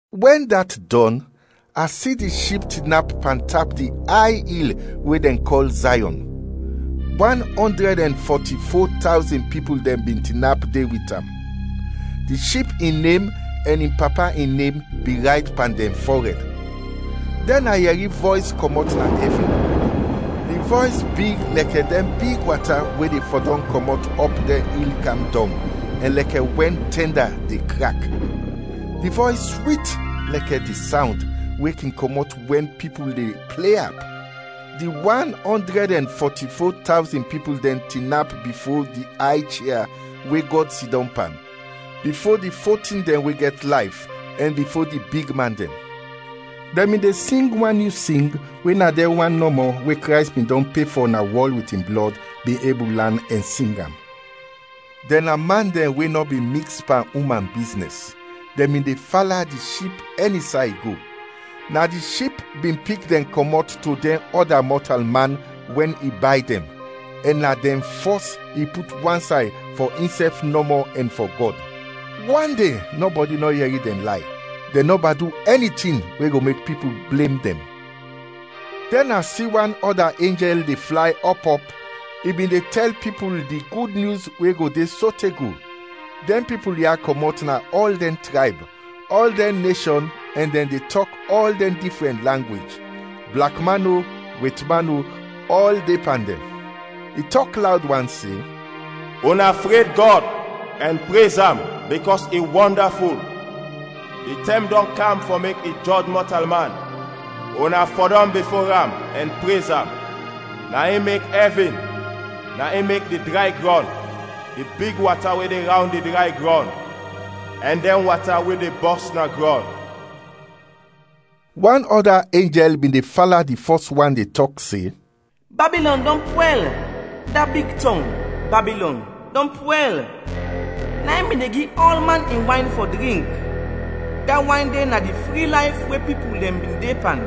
Wɛn dat dɔn, a si di Ship tinap pantap di ay il we dɛn kɔl Zayɔn. Wan ɔndrɛd ɛn fɔti-fo tawzin pipul bin tinap de wit am. Di Ship in nem ɛn in Papa in nem bin rayt pan dɛn fɔrɛd. Dɛn a yɛri vɔys kɔmɔt na ɛvin; di vɔys big lɛkɛ dɛn big wata we de fɔdɔm kɔmɔt ɔp dɛn il kam dɔng ɛn lɛkɛ wɛn tɛnda de krak. Di vɔys swit lɛkɛ di sawnd we kin kɔmɔt wɛn pipul de ple ap. Di wan ɔndrɛd ɛn fɔti-fo tawzin pipul dɛn tinap bifo di ay chia we Gɔd sidɔm pan, bifo di fo tin dɛn we gɛt layf, ɛn bifo di bigman dɛn. Dɛn bin de sing wan nyu sing we na dɛn wan nɔmɔ, we Krays bin dɔn pe fɔ na wɔl wit in blɔd, bin ebul lan ɛn sing am. Dɛn na man dɛn we nɔ bin miks pan uman biznɛs; dɛn bin de fala di Ship ɛni say i go. Na di Ship bin pik dɛn kɔmɔt to dɛn ɔda mɔtalman wɛn i bay dɛn, ɛn na dɛn fɔs i put wansay fɔ insɛf nɔmɔ ɛn fɔ Gɔd. Wande nɔbɔdi nɔ yɛri dɛn lay; dɛn nɔba du ɛni tin we go mek pipul blem dɛn. Dɛn a si wan ɔda enjɛl de flay ɔp ɔp, i bin de tɛl pipul di Gud Nyus we go de sote go, dɛn pipul ya kɔmɔt na ɔl dɛn trayb, ɔl dɛn neshɔn ɛn dɛn de tɔk ɔl dɛn difrɛn langwej, blak man o, wetman o, ɔl de pan dɛn. I tɔk lawd wan se, “Una fred Gɔd, ɛn prez am bikɔs i wɔndaful! Di tɛm dɔn kam fɔ mek i jɔj mɔtalman. Una fɔdɔm bifo am ɛn prez am, na in mek ɛvin, na in mek di dray grɔn, di big wata we de rawnd di dray grɔn ɛn dɛn wata we de bɔs na grɔn!” Wan ɔda enjɛl bin de fala di fɔs wan de tɔk se, “Babilɔn dɔn pwɛl! Da big tɔng, Babilɔn, dɔn pwɛl! Na in bin de gi ɔlman in wayn fɔ drink; da wayn de na di fri layf we pipul dɛn bin de pan,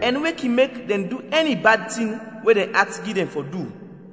ɛn we kin mek dɛn du ɛni bad tin we dɛn at gi dɛn fɔ du.”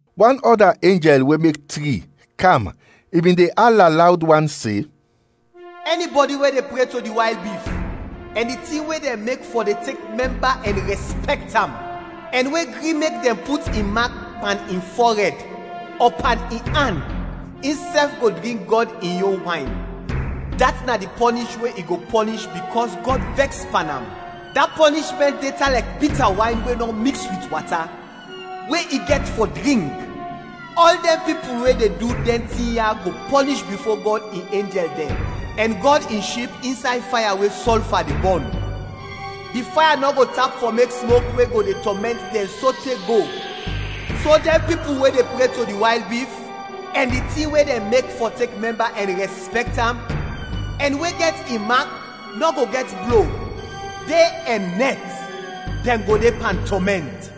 Wan ɔda enjɛl we mek tri, kam, i bin de ala lawd wan se, “Ɛnibɔdi we de pre to di wayl bif ɛn di tin we dɛn mek fɔ de tek mɛmba ɛn rɛspɛkt am, ɛn we gri mek dɛn put in mak pan in fɔrɛd ɔ pan in an, insɛf go drink Gɔd in yon wayn, dat na di pɔnish we i go pɔnish bikɔs Gɔd vɛks pan am, da pɔnishmɛnt de tan lɛkɛ bita wayn we nɔ miks wit wata we i gɛt fɔ drink. Ɔl dɛn pipul we de du dɛn tin ya go pɔnish bifo Gɔd in enjɛl dɛn ɛn Gɔd in Ship insay faya we sɔlfa de bɔn. Di faya nɔ go tap fɔ mek smok we go de tɔmɛnt dɛn sote go, so dɛn pipul we de pre to di wayl bif ɛn di tin we dɛn mek fɔ tek mɛmba ɛn rɛspɛkt am, ɛn we gɛt in mak nɔ go gɛt blo; de ɛn nɛt, dɛn go de pan tɔmɛnt.”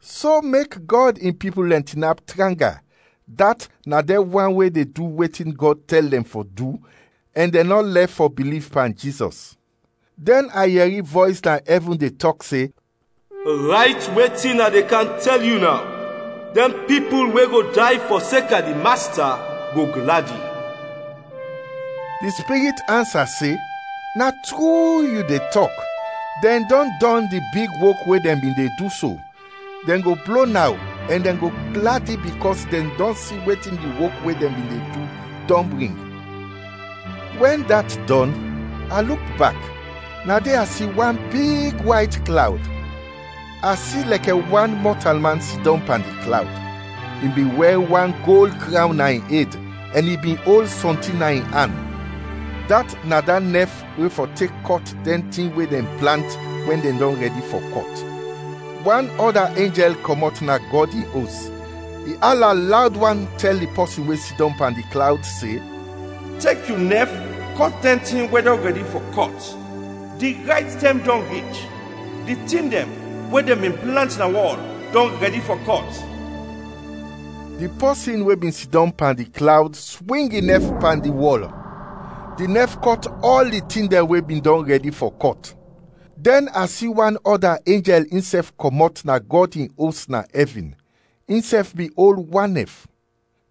So mek Gɔd in pipul dɛn tinap tranga, dat na dɛn wan we de du wetin Gɔd tɛl dɛn fɔ du ɛn dɛn nɔ lɛf fɔ biliv pan Jizɔs. Dɛn a yɛri vɔys na ɛvin de tɔk se, “Rayt wetin a de kam tɛl yu naw: Dɛn pipul we go day fɔseka di Masta, go gladi!” Di Spirit ansa se, “Na tru yu de tɔk, dɛn dɔn dɔn di big wok we dɛn bin de du so, dɛn go blo naw ɛn dɛn go gladi bikɔs dɛn dɔn si wetin di wok we dɛn bin de du, dɔn bring.” Wɛn dat dɔn, a luk bak, na de a si wan big wayt klawd. A si lɛkɛ wan mɔtalman sidɔm pan di klawd. I bin wɛr wan gold krawn na in ed ɛn i bin ol sɔntin na in an, dat na da nɛf we fɔ tek kɔt dɛn tin we dɛn plant wɛn dɛn dɔn rɛdi fɔ kɔt. Wan ɔda enjɛl kɔmɔt na Gɔd in Os, i ala lawd wan tɛl di pɔsin we sidɔm pan di klawd se, “Tek yu nɛf kɔt dɛn tin we dɔn rɛdi fɔ kɔt, di rayt tɛm dɔn rich, di tin dɛn we dɛn bin plant na wɔl dɔn rɛdi fɔ kɔt!” Di pɔsin we bin sidɔm pan di klawd swing in nɛf pan di wɔl; di nɛf kɔt ɔl di tin dɛn we bin dɔn rɛdi fɔ kɔt. Dɛn a si wan ɔda enjɛl insɛf kɔmɔt na Gɔd in Os na ɛvin, insɛf bin ol wan nɛf.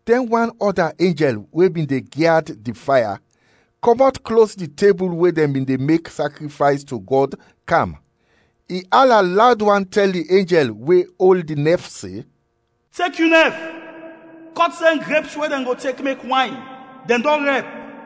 Dɛn wan ɔda enjɛl we bin de gyad di faya, kɔmɔt klos di tebul we dɛn bin de mek sakrifays to Gɔd, kam. I ala lawd wan tɛl di enjɛl we ol di nɛf se, “Tek yu nɛf, kɔt dɛn greps we dɛn go tek mek wayn, dɛn dɔn rɛp!”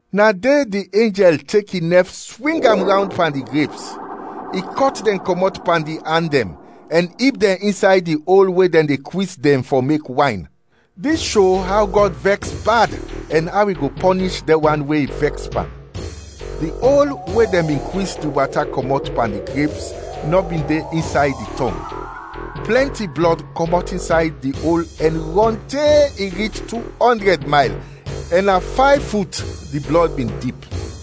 Na de di enjɛl tek in nɛf swing am rawnd pan di greps, i kɔt dɛn kɔmɔt pan di an dɛn, ɛn ib dɛn insay di ol we dɛn de kwis dɛn fɔ mek wayn. Dis sho aw Gɔd vɛks bad ɛn aw i go pɔnish dɛn wan we i vɛks pan. Di ol we dɛn bin kwis di wata kɔmɔt pan di greps nɔ bin de insay di tɔng; plɛnti blɔd kɔmɔt insay di ol ɛn rɔn te i rich tu ɔndrɛd mayl ɛn na fayv fut di blɔd bin dip.